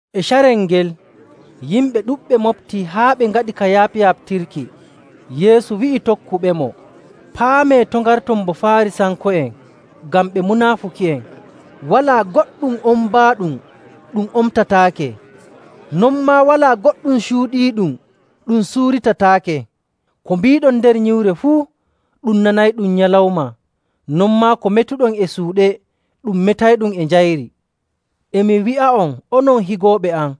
E carel ngel, yimɓe ɗuɗɓe moɓtii haa ɓe ngaɗi ka yaɓyaɓtirki. Yeesu wi'i tokkuɓemo, “Paamee to' ngarton bo Faarisanko'en ngam ɓe munaafuki'en.. Walaa goɗɗum ombaaɗum ɗum omtataake, non maa walaa goɗɗum cuuɗiiɗum ɗum suuritataake.. Ko mbiiɗon nder nyiwre fuu, ɗum nanayɗum nyalawma, non maa ko metuɗon e suuɗe, ɗum metayɗum e njayri. “E mi wi'a'on, onon higooɓe am,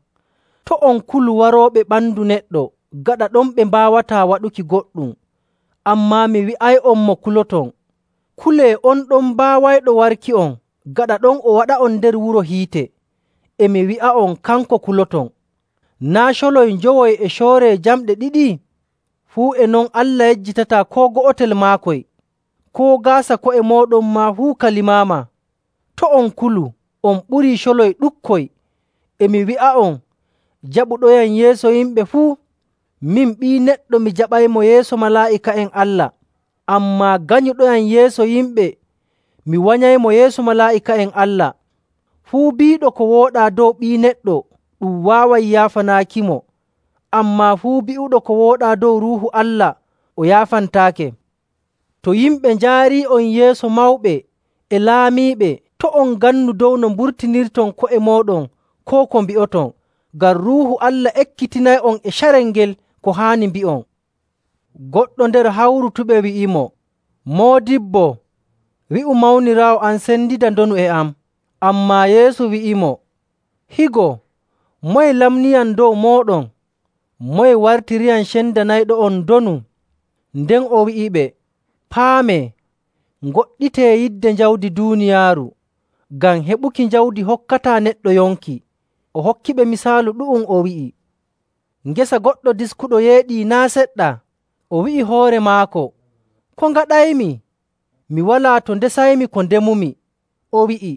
to' on kulu warooɓe ɓandu neɗɗo, gaɗa ɗon ɓe mbaawataa waɗuki goɗɗum. Ammaa mi wi'ay'on mo kuloton. Kulee on ɗon baawayɗo warki'on gaɗa ɗon o waɗa'on nder wuro hiite, e mi wi'a'on, kanko kuloton! “Naa' coloy njowoy e cooree jamɗe ɗiɗi? Fuu e non Allah yejjitataa koo go'otel maakoy. Koo gaasa ko'e mooɗon maa fuu ka limaama. To' on kulu, on ɓurii coloy ɗuɗkoy. “E mi wi'a'on, jaɓuɗoyam yeeso yimɓe fuu, min Ɓii Neɗɗo, mi jaɓaymo yeeso malaa'ika'en Allah. Ammaa ganyuɗoyam yeeso yimɓe, mi wanyaymo yeeso malaa'ika'en Allah. “Fuu bi'uɗo ko wooɗaa dow Ɓii Neɗɗo, ɗum waaway yaafanaakimo. Ammaa fuu bi'uɗo ko wooɗaa dow Ruuhu Allah, o yaafantaake.. “To yimɓe njaarii'on yeeso mawɓe e laamiiɓe, to' on ngannu dow no mburtinirton ko'e mooɗon koo ko mbi'oton. Ngam Ruuhu Allah ekkitinay'on e carel ngel ko haani mbi'on.”. Goɗɗo nder hawrutuɓe wi'imo, “Moodibbo, wi'u mawniraawo am sendida ndonu e am.” Ammaa Yeesu wi'imo, “Higo! Moye lamniyam dow mooɗon? Moye wartiriyam cendanayɗo'on ndonu?” Nden o wi'iɓe, “Paamee! Ngoɗɗitee yidde jawdi duuniyaaru, ngam heɓuki jawdi hokkataa neɗɗo yonki.” O hokkiɓe misaalu ɗu'um, o wi'i, “Ngesa goɗɗo diskuɗo yeeɗii naa' seɗɗa. O wi'i hoore maako, ‘Ko ngaɗaymi? Mi walaa to ndesaymi ko ndemumi.’ O wi'i,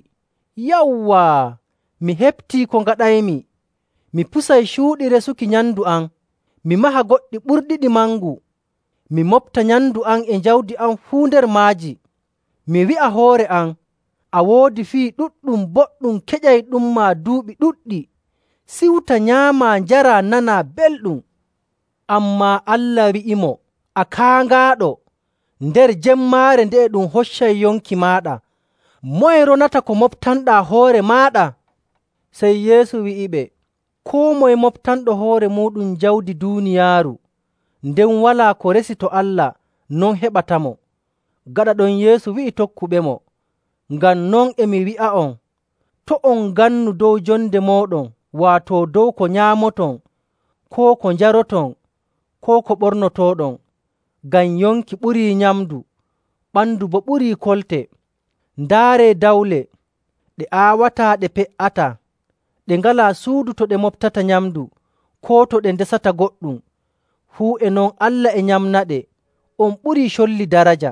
‘Yawwaa! Mi heɓtii ko ngaɗaymi, mi pusay cuuɗi resuki nyamndu am, mi maha goɗɗi ɓurɗiɗi mangu, mi moɓta nyamndu am e jawdi am fuu nder maaji. Mi wi'a hoore am “A woodi fii ɗuɗɗum boɗɗum keƴayɗumma duuɓi ɗuɗɗi. Siwta, nyaamaa, njaraa, nanaa belɗum.” ’ Ammaa Allah wi'imo, ‘A kaaŋaaɗo! Nder jemmaare nde'e ɗum hoccay yonki maaɗa. Moye ronata ko moɓtanɗaa hoore maaɗa?’” Sey Yeesu wi'iɓe, “Koo moye moɓtanɗo hoore muuɗum jawdi duuniyaaru, nden walaa ko o resi to Allah, non heɓatamo.” Gaɗa ɗon, Yeesu wi'i tokkuɓemo, “Ngam non e mi wi'a'on, to' on ngannu dow jonde mooɗon, waato dow ko nyaamoton koo ko njaroton koo ko ɓornotooɗon. Ngam yonki ɓurii nyamndu, ɓandu boo ɓurii kolte. Ndaaree dawle. Ɗe aawataa, ɗe pe''ataa, ɗe ngalaa suudu to ɗe moɓtata nyamndu koo to ɗe ndesata goɗɗum; fuu e non Allah e nyamnaɗe. On ɓurii colli daraja!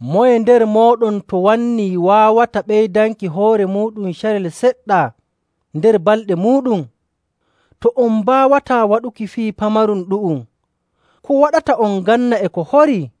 Moye nder mooɗon to wannii waawata ɓeydanki hoore muuɗum carel seɗɗa nder balɗe muuɗum? To on mbaawataa waɗuki fii pamarum ɗu'um, ko waɗata on nganna e ko horii?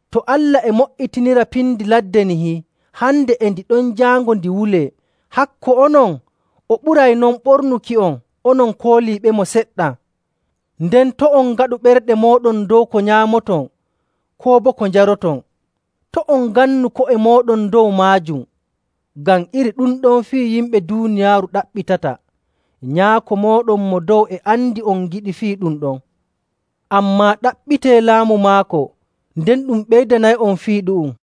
To Allah e mo''itinira pindi ladde nihi, hande e ndi ɗon, jaango ndi wulee, hakko onon, o ɓuray non ɓornuki'on, onon kooliiɓemo seɗɗa. “Nden to' on ngaɗu ɓerɗe mooɗon dow ko nyaamaton koo boo ko njaroton. To' on ngannu ko'e mooɗon dow maajum. Ngam iri ɗum ɗon fii yimɓe duuniyaaru ɗaɓɓitata. Nyaako mooɗon Mo Dow e andi on ngiɗi fii ɗum ɗon. Ammaa ɗaɓɓitee laamu maako, nden ɗum ɓeydanay'on fii ɗu'um.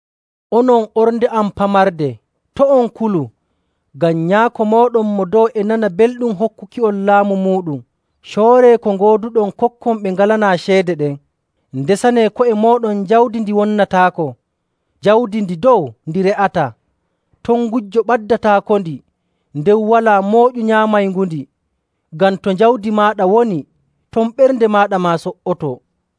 “Onon ornde am pamarde, to' on kulu, ngam Nyaako mooɗon Mo Dow e nana belɗum hokkuki'on laamu muuɗum. Cooree ko ngooduɗon, kokkon ɓe ngalanaa ceede ɗen. Ndesanee ko'e mooɗon jawdi ndi wonnataako, jawdi ndi dow ndi re'ataa. Ton gujjo ɓaddataakondi, nden walaa mooƴu nyaamayngundi. Ngam to jawdi maaɗa woni, ton ɓernde maaɗa maa so''otoo.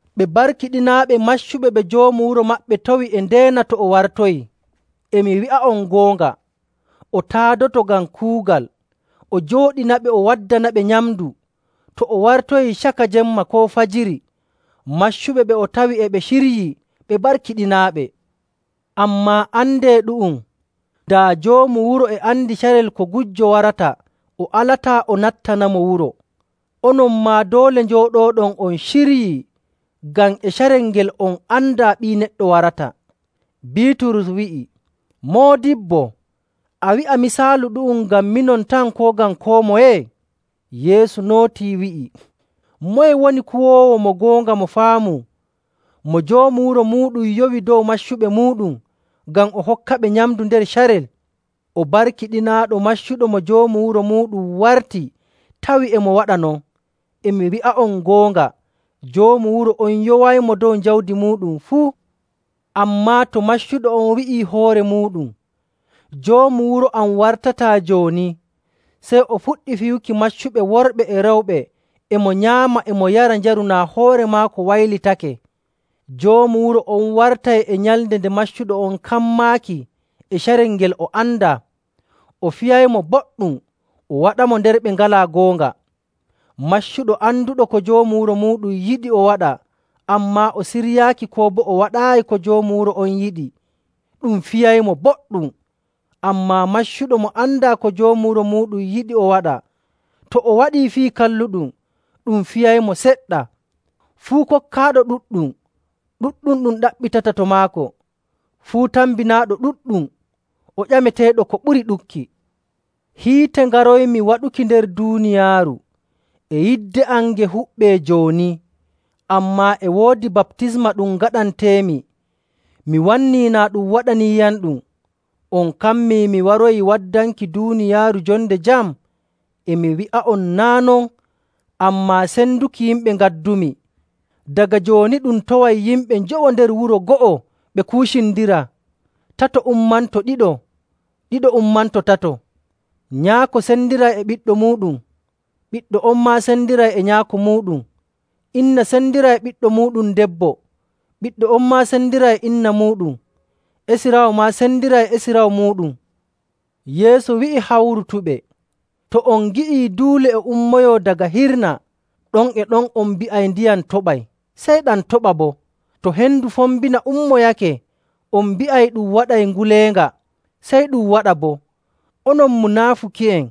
Ɓe barkiɗinaaɓe maccuɓe ɓe joomu wuro maɓɓe tawi e ndeena to o wartoyii. E mi wi'a'on goonga, o taadoto ngam kuugal, o joɗɗinaɓe, o waddanaɓe nyamndu. To o wartoyii caka jemma koo fajiri, maccuɓe ɓe o tawi e ɓe ciryi, ɓe barkiɗinaaɓe. Ammaa andee ɗu'um, daa joomu wuro e andi carel ko gujjo warata, o alataa o nattanamo wuro. Onon maa doole njooɗooɗon on ciryii ngam e carel ngel on andaa Ɓii Neɗɗo warata.”. Biiturus wi'i, “Moodibbo, a wi'a misaalu ɗu'um ngam minon tan koo ngam koo moye?” Yeesu nootii wi'i, “Moye woni kuwoowo mo goonga mo faamu, mo joomu wuro muuɗum yowi dow maccuɓe muuɗum, ngam o hokkaɓe nyamndu nder carel? O barkiɗinaaɗo maccuɗo mo joomu wuro muuɗum warti tawi e mo waɗa non. E mi wi'a'on goonga, joomu wuro on yowaymo dow jawdi muuɗum fuu. Ammaa to maccuɗo on wi'ii hoore muuɗum, ‘Joomu wuro am wartataa jooni,’ sey o fuɗɗi fiyuki maccuɓe worɓe e rewɓe e mo nyaama e mo yara njaru naa hoore maako waylitake. Joomu wuro on wartay e nyalnde nde maccuɗo on kammaaki e carel ngel o andaa, o fiyaymo boɗɗum o waɗamo nder ɓe ngalaa goonga. “Maccuɗo anduɗo ko joomu wuro muuɗum yiɗi o waɗa, ammaa o siryaaki koo boo o waɗaayi ko joomu wuro on yiɗi, ɗum fiyaymo boɗɗum. Ammaa maccuɗo mo andaa ko joomu wuro muuɗum yiɗi o waɗa, to o waɗii fii kalluɗum, ɗum fiyaymo seɗɗa. Fuu kokkaaɗo ɗuɗɗum, ɗuɗɗum ɗum ɗaɓɓitata to maako. Fuu tambinaaɗo ɗuɗɗum, o ƴameteeɗo ko ɓuri ɗuɗki. “Hiite ngaroymi waɗuki nder duuniyaaru, e yidde am nge huɓɓee jooni. Ammaa e woodi baptisma ɗum ngaɗanteemi, mi wannii naa ɗum waɗaniiyamɗum.. On kammii mi waroyi waddanki duuniyaaru jonde jam? E mi wi'a'on, naa' non, ammaa senduki yimɓe ngaddumi. Daga jooni ɗum taway yimɓe njowo nder wuro go'o ɓe kuucindiraa, tato ummanto ɗiɗo, ɗiɗo ummanto tato. Nyaako sendiray e ɓiɗɗo muuɗum, ɓiɗɗo on maa sendiray e nyaako muuɗum. Inna sendiray e ɓiɗɗo muuɗum debbo, ɓiɗɗo on maa sendiray e inna muuɗum. Esiraawo maa sendiray e esiraawo muuɗum.”. Yeesu wi'i hawrutuɓe, “To on ngi'ii duule e ummoyoo daga hirna, ɗon e ɗon on mbi'ay, ‘Ndiyam toɓay,’ sey ɗam toɓa boo. To hendu fombina ummoyake, on mbi'ay, ‘Ɗum waɗay nguleenga,’ sey ɗum waɗa boo. Onon munaafuki'en!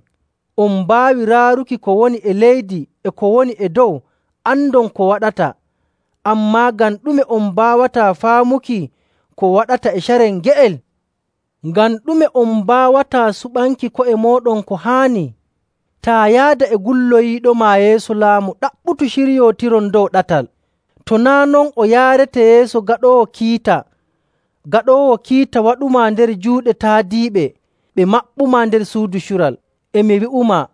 On mbaawi raaruki ko woni e leydi e ko woni e dow andon ko waɗata, ammaa ngam ɗume on mbaawataa faamuki ko waɗata e carel nge'el? “Ngam ɗume on mbaawataa suɓanki ko'e mooɗon ko haani? Taa yaada e gulloyiiɗoma yeeso laamu, ɗaɓɓutu ciryootiron dow ɗatal. To naa' non, o yaarete yeeso gaɗoowo kiita, gaɗoowo kiita waɗumaa nder juuɗe taadiiɓe ɓe maɓɓumaa nder suudu cural. E mi wi'umaa,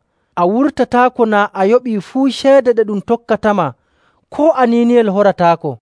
a wurtataako naa a yoɓii fuu ceede ɗe ɗum tokkatama koo aniiniyel horataako.”